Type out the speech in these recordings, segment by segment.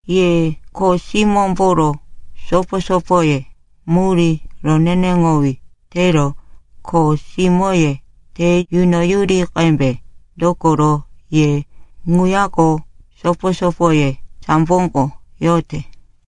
Ye kho simómboro sopo-sopoye, murí roneneŋowí tero kho simóye te yunoyuri qembe. Dokoro ye ŋuyako sopo-sopoye samboko yote.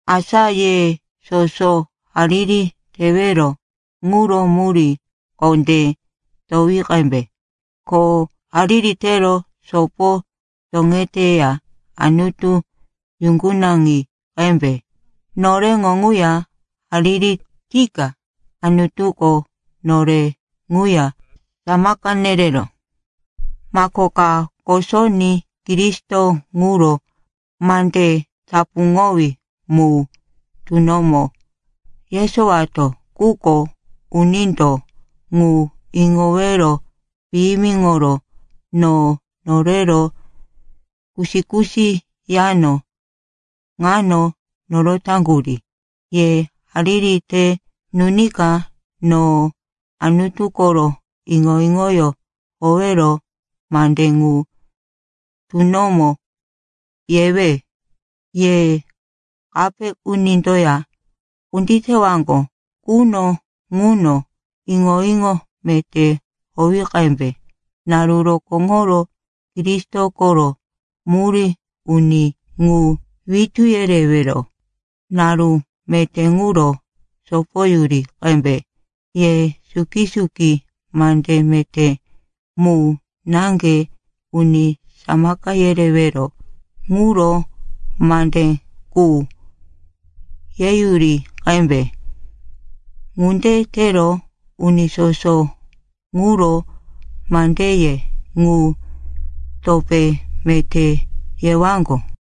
Asa ye soso hariri tewero ŋuro murí kondé towi qembe. Ko hariri tero sopo toŋeteya Anutu yuŋgunaŋi qembe. Noreŋo ŋuya hariri tika Anutuko nore ŋuya samaka nerero mako ka kosoní Kristo ŋuro mande tapuŋowí mu tunomo yesowato. Quko unindo ŋu iŋowero piyimiŋoro no norero kusi-kusi yano ŋano norotaŋgurí. Ye hariri te nunika no Anutu koro iŋo-iŋoyó howero mande ŋu tunomo yewe. Ye kape unindoya kunditewaŋgo quno ŋuno, iŋo-iŋo meté howi qembe. Naru rokóŋoro Kristo koro murí uni ŋu witú yerewero naru meté ŋuro sopoyuri qembe. Ye suki-suki mande meté mu naŋge, uni samaka yerewero ŋuro mande qu yeyuri qembe. Ŋunde tero uni soso ŋuro mandeye ŋu topé meté yewaŋgo.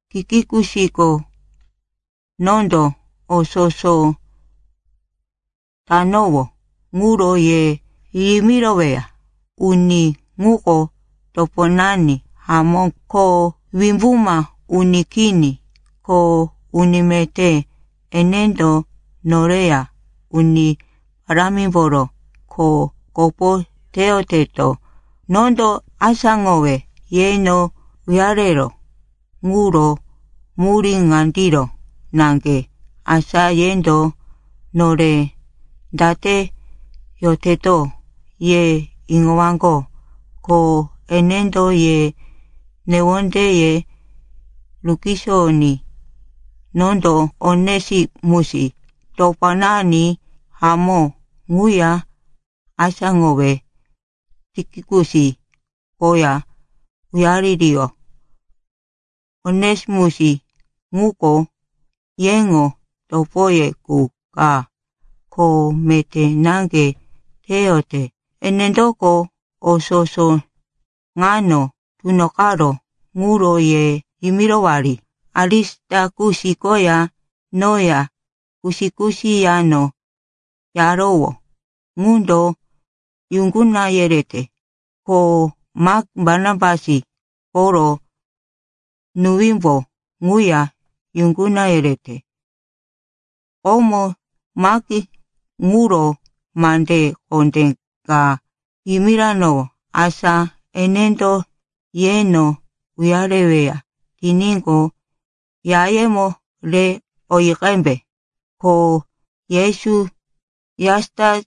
Tikikusko nondo o soso tanowó ŋuro ye yimiroweya. Uni ŋuko toponani hamó ko wimbuma uni kini, kho uni meté. Enendo noreya Uni Parámimboro kho kopo teyoteto. Nondo asáŋowe yeno uyareró ŋuro murí ŋandiro naŋge, asa yendo nore date yoteto ye iŋowaŋgo, ko enendo ye newondeye rukisoyoní. Nondo Onesimus, toponani hamó ŋuya asáŋowe Tikikus koya uyaririyó. Onesimus ŋuko yeŋo topoye qu ka, kho meté naŋge teyote. Enendoko o soso ŋano tunoqaró ŋuro ye yimirowari. Arisitakus koya noya kusi-kusi yano yarowó ŋundo yuŋguna yerete, ko Mak, Barnabas koro nuwímbo ŋuya yuŋguna yerete. (Komo Mak ŋuro mande kondé ka yimiranowó, asa enendo yeno uyareweya tiníqo, yayemo re oyi qembe.) Ko Yesu, Jastus,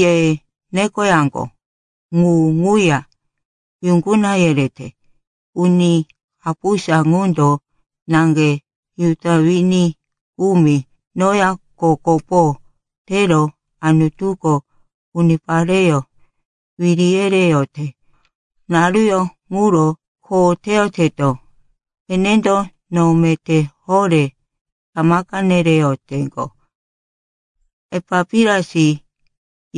ye nekoyaŋgo, ŋu ŋuya yuŋguna yerete. Uni kapusa ŋundo naŋge Juda wini kumi noya kho kopo tero Anutuko unipareyó wiri yereyote naruyó ŋuro kho teyoteto. Enendo no meté horé samaka nereyoteŋgo. Epapiras,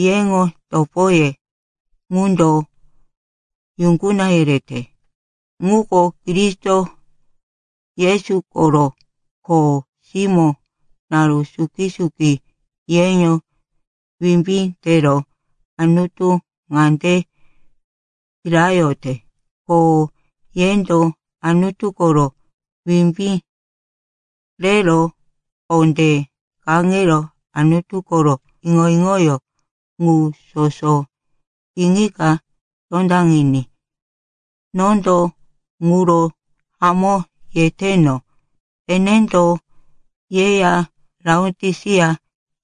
yeŋo topoye ŋundo yuŋguna yerete. Ŋuko Kristo Yesu koro kho simó. Naru suki-suki yeŋo wimbí tero Anutu ŋande kirayote, ko yendo Anutu koro wimbí rero kondé kaŋero Anutu koro iŋo-iŋoyó ŋu soso iŋika tondaŋiní. Nondo ŋuro hamó yeteno, enendo yeya Laotisia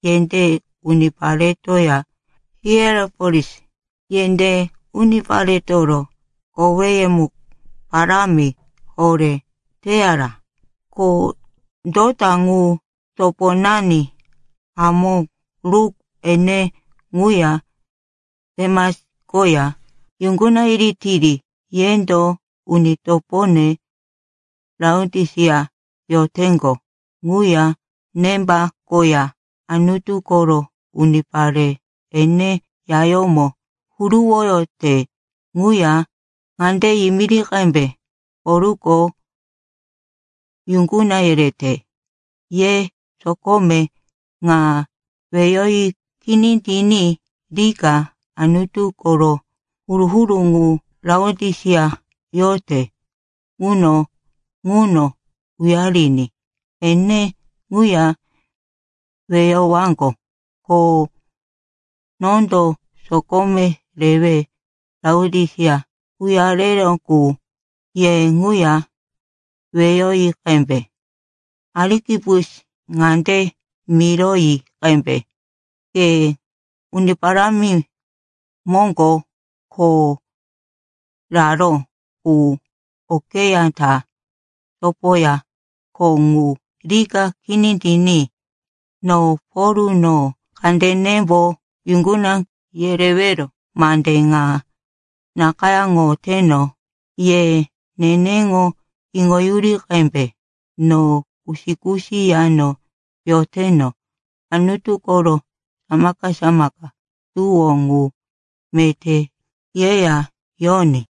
yendé uniparetoya Hierapolis yendé uniparetoro koweyumu parámi horé teyara. Ko dota ŋu, toponani hamó Luk, ene ŋuya Demas koya yuŋguna yiritiri. Yendo uni topone Laotisia yoteŋgo ŋuya Nemba koya Anutu koro unipare ene yayómo huruwoyote ŋuya ŋande yimiri qembe, “Polko yuŋguna yerete.” Ye sokome ŋa weyoyi kini tiní rika Anutu koro huru-huru ŋu Laotisia yote quno ŋuno uyariní, ene ŋuya weyowaŋgo. Ko nondo sokome rewe Laotisia uyareró qu ye ŋuya weyoyi qembe. Arikipus ŋande miroyi qembe, “Ke Uni Parámi moŋgo kho raró ŋu okeyá ta sopoya kho ŋu rika kini tiní.” No Pol, no kandenembo yuŋguna yerewero mande ŋa nakayáŋoteno. Ye neneŋo iŋoyuri qembe, no kusi-kusi yano yoteno. Anutu koro samaka-samaka tuwó ŋu meté yeya yoní.